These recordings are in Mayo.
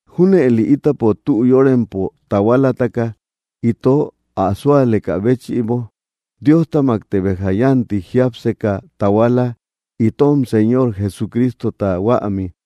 Júnëli ítapo tü yórempo tahualataka, ito ä súalekä béchïbo, Diostamakte béja yánti jiapseka tahuala, itom Señor Jesucristota huami.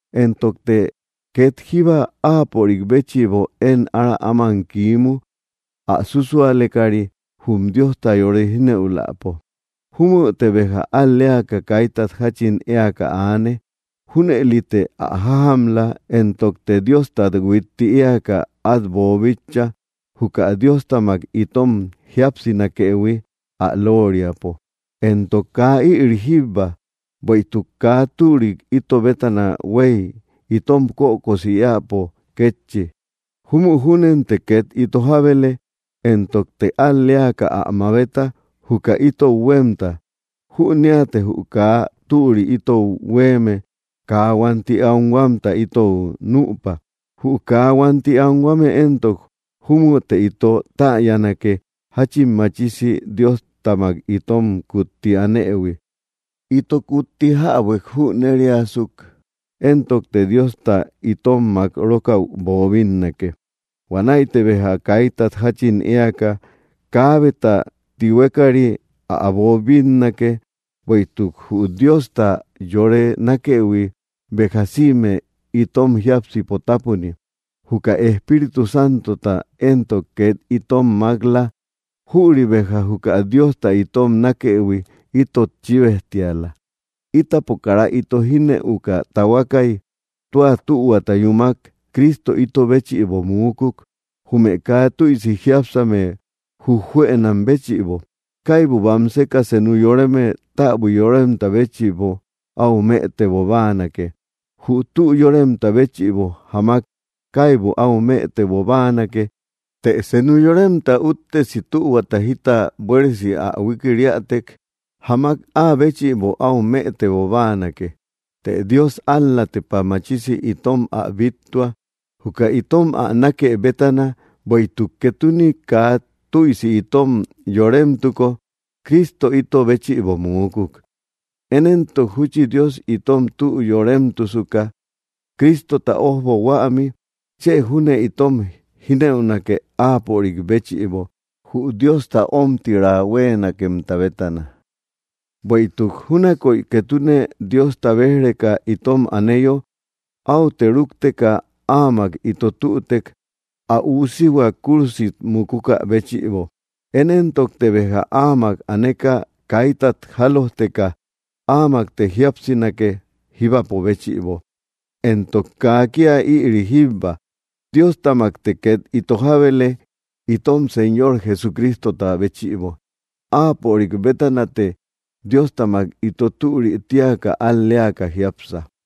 Entokte két jíba áapörik béchïbo én ára áman kiimu, ä súsualekari jum Diosta yore jínëuläpo. Júmüte béja al‑leaka kaitat jáchin éaka aane. Júnëlite ä jájamla; entokte Diostat huitti eaka át boobíchaïhui, juka Diostamak itom jíapsinakëhui ä lóoriapo. Entok kaa ïri jíbba, bueïtuk kaa türik ito bétana huéy itom kökosi éäpo kétchi. Júmü júnente két ito jábele, entokte al‑leaka ä mabeta, juka ítou huémta. Jüneate jü kaa türi ítou huéeme kaa huánti anhuamta itou nüpa. Jü kaa huánti anhuame éntok, júmüte ito täyanake, jáchin machisi Diostamak itom kutti anëhui. Ito kutti jabuek jüneriasuk éntokte Diosta itom mák rókäu boobinnake. Huanäite béja kaitat jáchin éaka, kaabeta tihuekari át boobinnake. Bueïtuk jü Diosta yore nákëhui béja sïme itom jiápsipo tapuni. Juka Espíritu Santota éntok két itom mák‑la. Jüri béja juka Diosta itom nákëhui itot chíbejtiala. Ítapo kara ito jinëuka tahuakay, tua tahuata yúmak Cristo ito béchïbo muukuk, jume kaa tüisi jiápsame jujjuënam béchïbo. Kaibu bamseka senu yoreme täbui yoremta béchïbo áu mëtebo báanake. Jü tü yóremta béchïbo jamak kaibu áu mëtebo báanake; të senu yoremta úttesi tühuata jita buéresi ä huikiriätek, jamak áa béchïbo áu mëtebo báanake. Të Dios ál‑la tepa machisi itom ä bíttua, juka itom ä nákë bétana, bueïtuk ketune kaa tüisi itom yóremtuko, Cristo ito béchïbo muukuk. Én éntok júchi Dios itom tü yóremtusuka, Cristota ojbo huami, chë júne itom jineünake, áapörik béchïbo, jü Diosta ómtiraa huéenakemta bétana. Bueïtuk júnakoy ketune Diosta béj‑reka itom aneyo, áute rúkteka áamak ito tütek, ä Üusihua kúrusit mukukä béchïbo. Én éntokte béja áamak aneka kaitat jálojteka, áamakte jíapsinake, jíbapo béchïbo. Entok kaa kía ïri jíbba; Diostamakte két ito jábele, itom Señor Jesucristota béchïbo. Áapörik bétanate Diostamak ito türi tíaka al‑leaka jiápsa.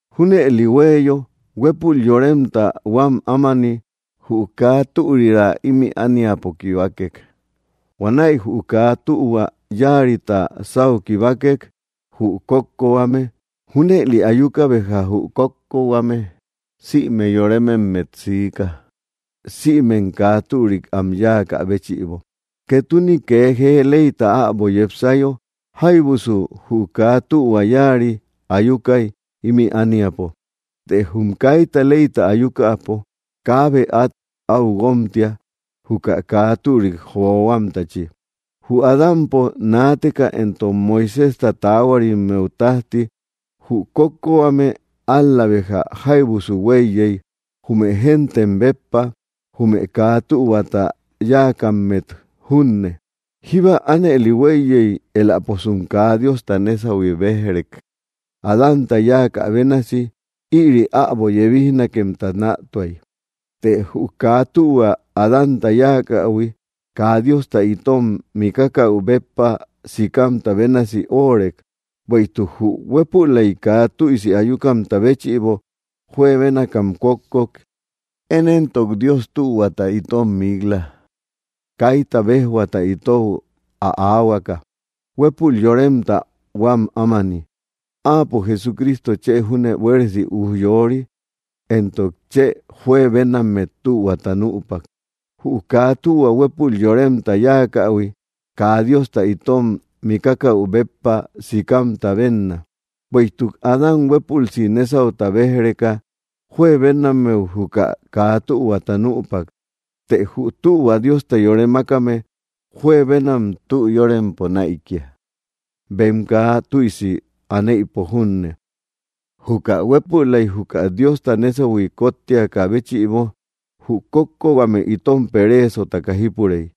Júnëli huéeyo, huépul yoremta huám ámani, jü kaa türira ímï ániapo kibakek. Huanäi jü kaa tühua yáarita sáu kibakek, jü kókkohuame. Junëli ayuka béja jü kókkohuame sïme yoremmet siika, sïmem kaa türik am yáakä béchïbo. Ketune kee jee leyta äbo yepsayo, jáybusu jü kaa tühua yáari ayukay, ímï ániapo. Të jum kaita leyta ayukäpo, kaabe át áu guómtia, juka kaa türik johuamtachi. Jü Adámpo naateka entok Moiséjta taahuarimmeu tájti, jü kókkohuame ál‑la béja jáybusu huéiyey, jume géntem béppa; jume kaa tühuata yáakammet junne. Jíba ánëli huéiyey, eläposum kaa Diosta nésahui béj‑rek, Adánta yáakä bénasi. Ïri äbo yebijnakemta nätuay. Të jü kaa tühua Adánta yáakähui kaa Diosta itom mikakäu béppa sikamta bénasi óorek; bueïtuk jü huépülaik kaa tüisi ayukamta béchïbo juebénakam kókkok. Én éntok Dios tühuata itom mik‑la, kaita béjhuaata itou ä aahuakä, huépul yoremta huám ámani. Áapo Jesucristo chë júne buéresi ujyori entok chë juebenammet tühuata nüpak. Jü kaa tühua huépul yoremta yáakähui kaa Diosta itom mikakäu béppa sikamta bénna. Bueïtuk Adán huépülsi nésauta béj‑reka, juebenammeu juka kaa tühuata nüpak; të jü tühua Diosta yore mákame juebenam tü yórempo näikia, bem kaa tüisi aneïpo junne. Juka huépülaik juka Diosta nésahui kóttiakä béchïbo jü kókkohuame itom pereesotaka jípurey.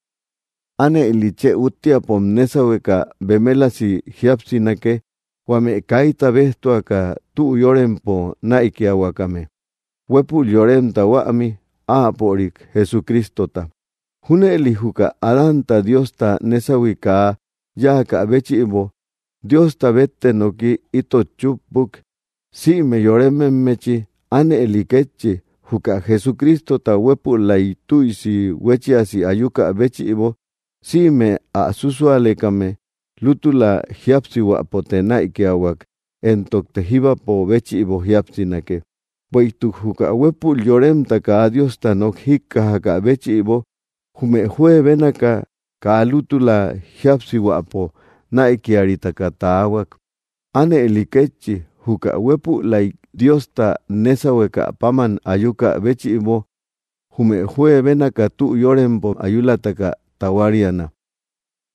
Ánëli chë úttiapom nésahueka bemelasi jíapsinake, huame kaita béjtuaka tü yórempo näikiahuakame, huépul yoremta huämi, áapörik Jesucristota. Júnëli juka Adánta Diosta nésahui kaa yáakä béchïbo, Diosta bette nooki itot chúppuk, sïme yorememmechi; ánëli kétchi, juka Jesucristota huepülaik tüisi huéchiasi ayukä béchïbo, sïme ä susualekame lútula jíapsihuäpote näikiahuak, entokte jíbapo béchïbo jíapsinake. Bueïtuk juka huépul yoremta kaa Diosta nok jíkkajakä béchïbo, jume juebénaka kaa lútula jíapsihuäpo näikiaritaka taahuak. Ánëli kétchi, juka huépülaik Diosta nésahuekä páman ayukä béchïbo, jume juebénaka tü yórempo ayulataka tahuariana.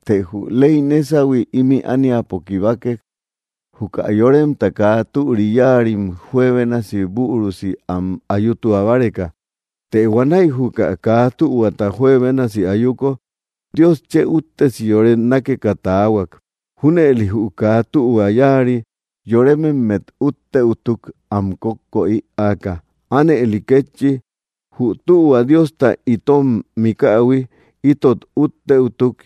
Të jü ley nésahui ímï ániapo kibakek, juka yoremta kaa türi yáarim juebénasi bürusi am ayutua báreka. Të huanäi juka kaa tühuata juebénasi ayuko, Dios chë úttesi yore nákeka taahuak. Júnëli jü kaa tühua yáari yorememmet uttëutuk, am kókko ïaaka. Ánëli kétchi, jü tühua Diosta itom mikähui itot utteütuk,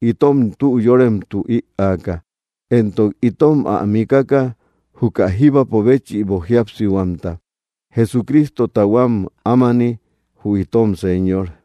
itom tü yóremtu ïaaka, entok itom ä mikaka, juka jíbapo béchïbo jíapsihuamta, Jesucristota huám ámani, jü itom Señor.